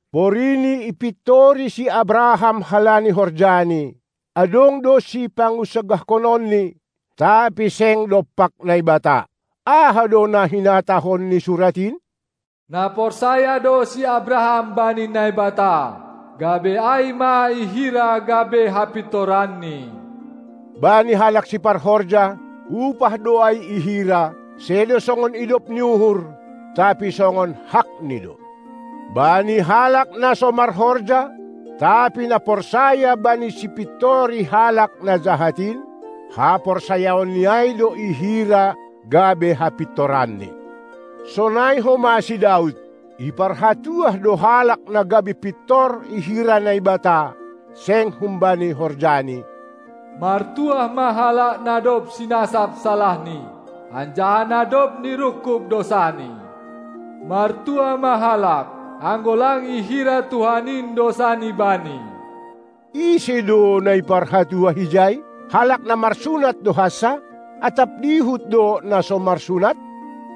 Porini ipintori si Abraham halani horjani, adong do sipangunsagahkononni, tapi seng dompak Naibata. Aha do na hinatahon ni Surat in? Na porsaya do si Abraham bani Naibata, gabe ai ma ihira gabe hapintoranni. Bani halak siparhorja, upah do ai ihira, sedo songon idop ni uhur, tapi songon hakni do. Bani halak na so marhorja, tapi na porsaya bani Sipintori halak na jahat in, haporsayaonni ai do ihira gabe hapintoranni. Sonai homa si Daud, iparhatuah do halak na gabe pintor ihira Naibata, seng humbani horjani: Martuah ma halak na dob sinasap salahni, anjaha na dob nirungkub dousani! Martuah ma halak, anggo lang ihira Tuhan in dousani bani! Ise do na iparhatuah ijai? Halak na marsunat do hansa, atap dihut do na so marsunat?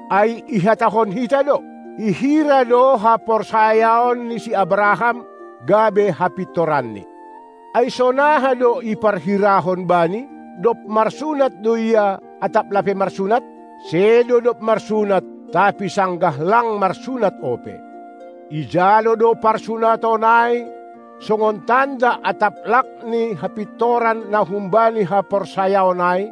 Ai ihatahon hita do: Ihira do haporsayaon ni si Abraham gabe hapintoranni. Ai sonaha do iparhirahon bani? Dob marsunat do ia, atap lape marsunat? Sedo dob marsunat, tapi sanggah lang marsunat ope. Ijalo do parsunaton ai songon tanda atap lak ni hapintoran na humbani haporsayaon ai,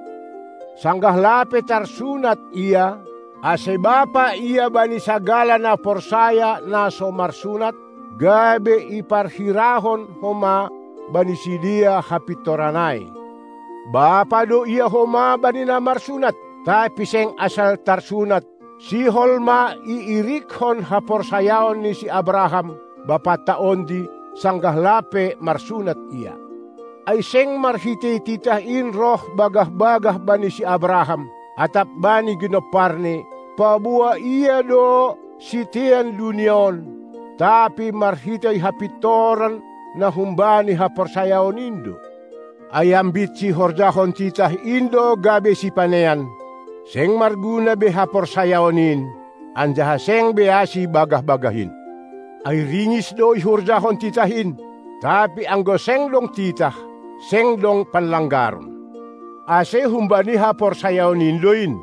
sanggah lape tarsunat ia, ase bapa ia bani sagala na porsaya na so marsunat, gabe iparhirahon homa bani sidea hapintoran ai. Bapa do ia homa bani na marsunat, tapi seng asal tarsunat, sihol ma iirikkon haporsayaon ni si Abraham, bapanta ondi, sanggah lape marsunat ia. Ai seng marhitei titah in roh bagah-bagah bani si Abraham atap bani ginomparni, paboa ia do sitean dunia on, tapi marhitei hapintoran na humbani haporsayaon in do. Ai ambit sihorjahon titah in do gabe sipanean, seng marguna be haporsayaon in, anjaha seng be asi bagah-bagah in. Ai ringis do ihorjahon titah in, tapi anggo seng dong titah, seng dong panlanggaron. Ase humbani haporsayaon in do in,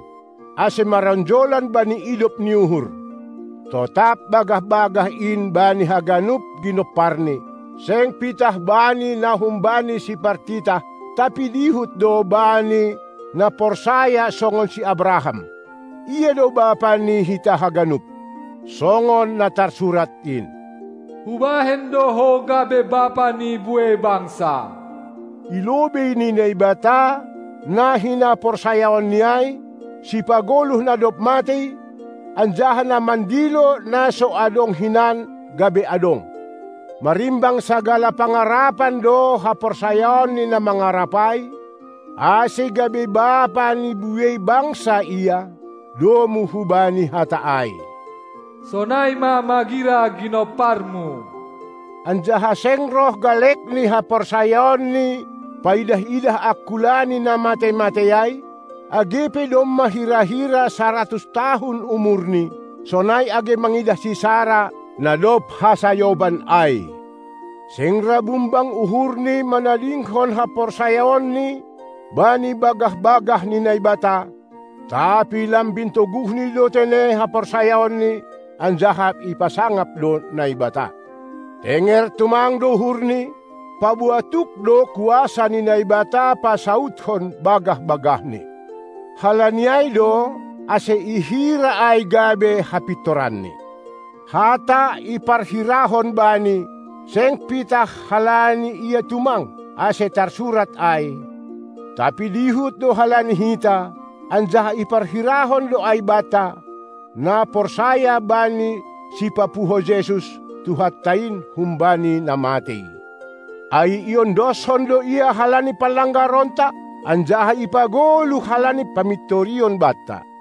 ase maronjolan bani idop ni uhur, totap bagah-bagah in bani haganup ginomparni, seng pitah bani na humbani sipartitah, tapi dihut do bani na porsaya songon si Abraham. Ia do bapa ni hita haganup, (songon na tarsurat in: Hubahen do ho gabe bapa ni buei bangsa) ilobei ni Naibata, na hinaporsayaanni ai, Sipagoluh na dob matei anjaha na mandilo na so adong hinan gabe adong. Marimbang sagala pangarapan do haporsayaonni na mangarap ai, ase gabe bapa ni buei bangsa ia, domu hubani hata ai: Sonai ma magira ginomparmu. Anjaha seng roh galekni haporsayaonni paidah-idah angkulani na matei-matei ai, age pe domma hira-hira saratus tahun umurni, sonai age mangidah si Sara na dob hasayoban ai. Seng ra bungbang uhurni manadingkon haporsayaonni bani bagah-bagah ni Naibata, tapi lambin toguhni do tene haporsayaonni anjaha ipasangap do Naibata. Tenger tumang do uhurni, paboa tuk do kuasa ni Naibata pasaudkon bagah-bagahNi. Halani ai do ase ihira ai gabe hapintoranni. Hata "iparhirahon bani", seng pitah halani ia tumang, ase tarsurat ai, tapi dihut do halani hita, anjaha iparhirahon do ai banta, na porsaya bani Sipapuho Jesus, Tuhanta in, humbani na matei. Ai iondoskon do Ia halani panlanggaronta, anjaha ipagoluh halani pamintorion banta.